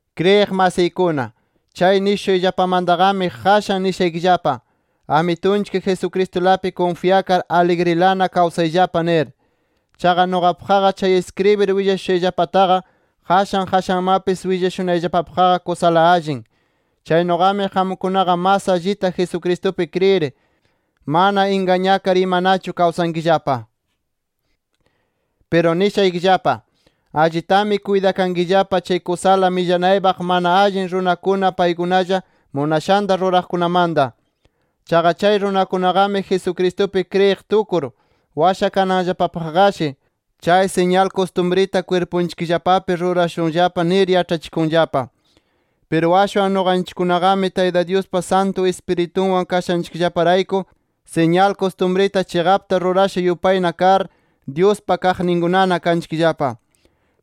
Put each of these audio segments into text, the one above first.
Kriyiq masiykuna, chay nishushayllapamantaqami, qashan nishaykillapa: Amitunchik Jesucristulapi kunfyakar aligrilana kawsayllapa nir. Chaqa nuqapaqqa chay iskribir willashushayllapataqa qashan qashanmapis willashunayllapapaqqa kusala allin. Chaynuqami qamkunaqa mas allita Jesucristupi kriyir, mana ingañakar imanachu kawsankillapa. Piru nishaykillapa: Allitami kuytakankillapa chay kusala millanaypaq mana allin runakuna paykunalla munashanta ruraqkunamanta. Chaqa chay runakunaqami Jesucristupi kriyiq tukur, washakananllapapaqqashi chay siñal kustumrita kwirpunchikllapapi rurashunllapa nir yaĉhachikunllapa. Piru ashwan nuqanchikkunaqami Tayta Dyuspa Santu Ispiritunwan kashanchikllaparayku siñal kustumrita chiqapta rurasha yupayna kar, Dyuspa kaqninkunana kanchikllapa.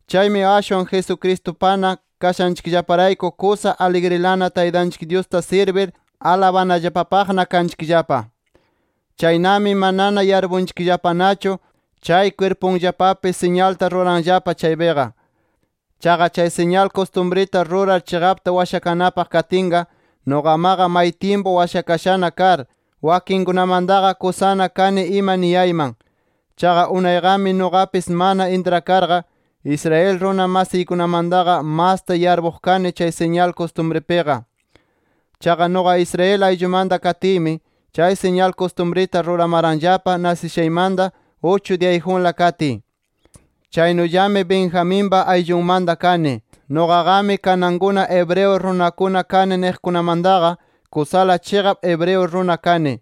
Chaymi ashwan Jesucristupana kashanchikllaparayku kusa aligrilana Taytanchik Dyusta sirbir alabanallapapaqna kanchikllapa. Chaynami manana yarpunchikllapanachu chay kwirpunllapapi siñalta ruranllapa chaypiqa. Chaqa chay siñal kustumrita rurar chiqapta washakanapaq katinqa, nuqamaqa may tyimpu washakashana kar, wakinkunamantaqa kusana kani ima niyayman. Chaqa unayqami nuqapis mana intrakarqa, Israel runa masiykunamantaqa, masta yarpuq kani chay siñal kustumripiqa. Chaqa nuqa Israel ayllumanta katiymi, chay siñal kustumrita ruramaranllapa, nasishaymanta uchu diyayjunla katiy. Chaynullami Benjaminpa ayllunmanta kani. Nuqaqami kanankuna hebreo runakuna kani niqkunamantaqa, kusala chiqap hebreo runa kani.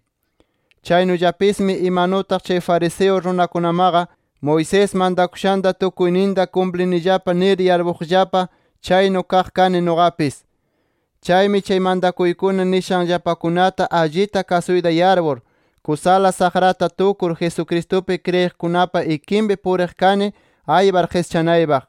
Chaynullapismi imanutaq chay fariseo runakunamaqa, Moisés mantakushanta tukuyninta kumplinillapa nir yarpuqllapa, chaynu kaq kani nuqapis. Chaymi chay mantakuykuna nishanllapakunata allita kasuyta yarpur, kusala saqrata tukur Jesucristupi kriyiqkunapa ikinpi puriq kani aypar qischanaypaq.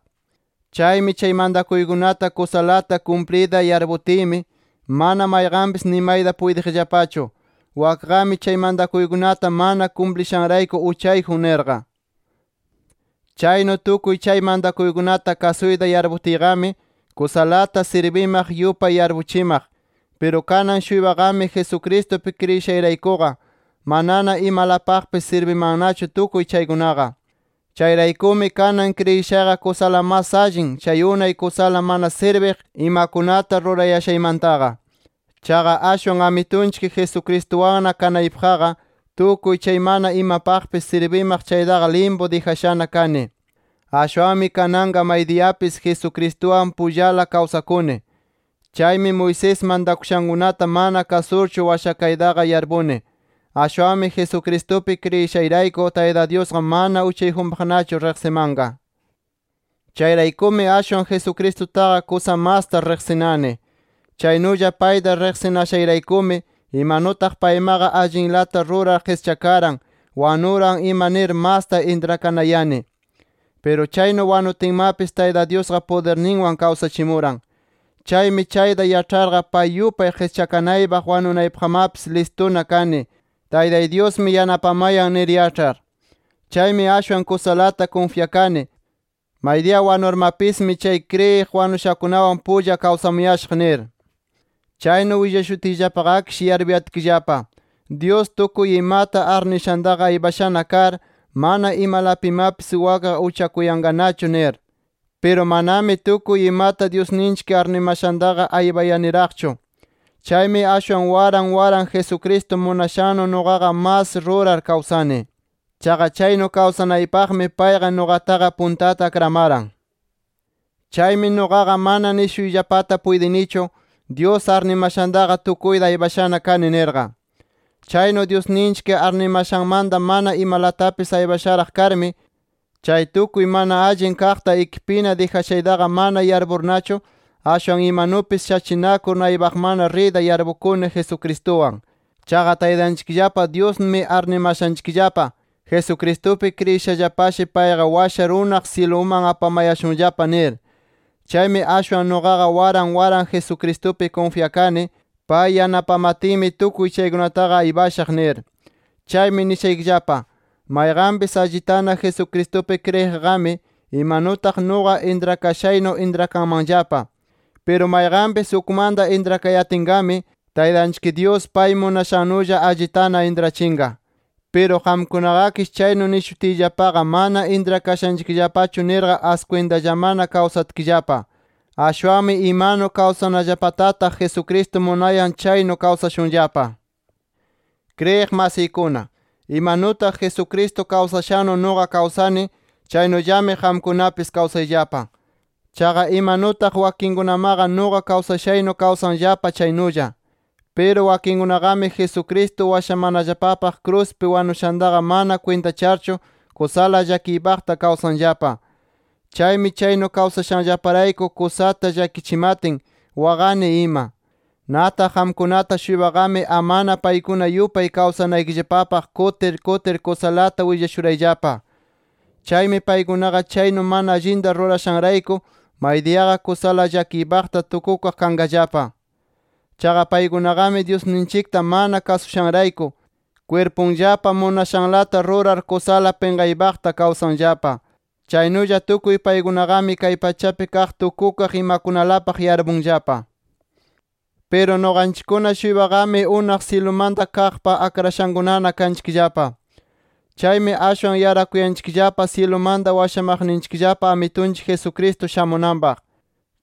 Chaymi chay mantakuykunata kusalata kumpliyta yarputiymi mana mayqanpis nimayta puytiqllapachu, wakqami chay mantakuykunata mana kumplishanrayku uchayjun nirqa. Chaynu tukuy chay mantakuykunata kasuyta yarputiyqami, kusalata sirbimaq yupay yarpuchimaq. Piru kanan-shuypaqami Jesucristupi kriyishayraykuqa, manana imalapaqpis sirbimannachu tukuy chaykunaqa. Chayraykumi kanan kriyishayqa kusala mas allin, chay unay kusala mana sirbiq imakunata rurayashaymantaqa. Chaqa ashwan Amitunchik Jesucristuwanna kanaypaqqa, tukuy chay mana imapaqpis sirbimaq chaytaqa limpu dijashana kani. Ashwanmi kananqa maydiyapis Jesucristuwan pullala kawsakuni. Chaymi Moisés mantakushankunata mana kasurchu washakaytaqa yarpuni. Ashwanmi Jesucristupi kriyishayrayku, Tayta Dyusqa mana uchayjunpaqnachu riqsimanqa. Chayraykumi ashwan Jesucristutaqa kusa masta riqsinani. Chaynulla payta riqsinashayraykumi imanutaq paymaqa allinlata rurar qischakaran, wanuran ima nir masta intrakanayani. Piru chaynu wanutinmapis Tayta Dyusqa pudirninwan kawsachimuran. Chaymi chayta yaĉharqa pay yupay qischakanaypaq wanunaypaqmapis listuna kani Taytay Dyusmi yanapamayan nir yaĉhar. Chaymi ashwan kusalata kunfyakani, maydiya wanurmapismi chay kriyir wanushakunawan pulla kawsamushaq nir. Chaynu willashutiyllapaqakish yarpuyatkillapa, Dyus tukuy imata arnishantaqa aypashana kar, mana imalapimapis wakqa uchakuyanqanachu nir. Piru manami tukuy imata Dyusninchik arnimashantaqa aypayaniraqchu. Chaymi ashwan waran waran Jesucristo munashannu nuqaqa mas rurar kawsanani. Chaqa chaynu kawsanaypaqmi payqa nuqataqa puntata akramaran. Chaymi nuqaqa mana nishuyllapata puytinichu, Dyus arnimashantaqa tukuyta aypashana kani nirqa. Chaynu Dyusninchik arnimashanmanta mana imalatapis aypasharaq karmi, chay tukuy mana allin kaqta ikipina dijashaytaqa mana yarpurnachu, ashwan imanupis shachinakur naypaqmanna riyta yarpukuni Jesucristuwan. Chaqa Taytanchikllapa Dyusmi arnimashanchikllapa Jesucristupi kriyishallapashi, payqa washar unaq syiluman apamayashunllapa nir. Chaymi ashwan nuqaqa waran waran Jesucristupi kunfyakani, pay yanapamatinmi, tukuy chaykunataqa aypashaq nir. Chaymi nishaykillapa: Mayqanpis allitana Jesucristupi kriyiqqami imanutaq nuqa intrakayashaynu intrakanmanllapa. Piru mayqanpis ukmanta intrakayatinqami, Taytanchik Dyus pay munashannulla allitana intrachinqa. Piru qamkunaqakish chaynu nishutiyllapaqa mana intrakashanchikllapachu nirqa askwintallamana kawsatkillapa. Ashwanmi imanu kawsanallapatataq Jesucristo munayan chaynu kawsashunllapa. Kriyiq masiykuna, imanutaq Jesucristo kawsashannu nuqa kawsani chaynullami qamkunapis kawsayllapa. Chaqa imanutaq wakinkunamaqa nuqa kawsashaynu kawsanllapa chaynulla. Piru wakinkunaqami, Jesucristo washamanallapapaq kruspi wanushantaqa mana kwintacharchu kusala llakiypaqta kawsanllapa. Chaymi chaynu kawsashanllaparayku kusata llakichimatin waqani ima. Nataq qamkunata-shuypaqami amana paykuna yupay kawsanaykillapapaq kutir kutir kusalata willashurayllapa. Chaymi paykunaqa chaynu mana allinta rurashanrayku maydiyaqa kusala llakiypaqta tukukaq kanqallapa. Chaqa paykunaqami Dyusninchikta mana kasushanrayku, kwirpunllapa munashanlata rurar, kusala pinqaypaqta kawsanllapa. Chaynulla tukuy paykunaqami kay pachapi kaq tukukaq imakunalapaq yarpunllapa. Piru nuqanchikkuna-shuypaqami unaq syilumanta kaqpa akrashankunana kanchikllapa. Chaymi ashwan yarakuyanchikllapa syilumanta washamaqninchikllapa Amitunchik Jesucristo shamunanpaq.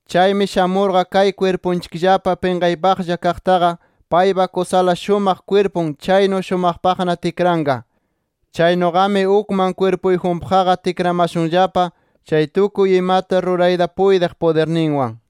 Chaymi shamurqa, kay kwirpunchikllapa pinqaypaqlla kaqtaqa paypa kusala shumaq kwirpun, chaynu shumaqpaqna tikranqa. Chaynuqami ukman kwirpuyjunpaqqa tikramashunllapa chay tukuy imata rurayta puytiq pudirninwan.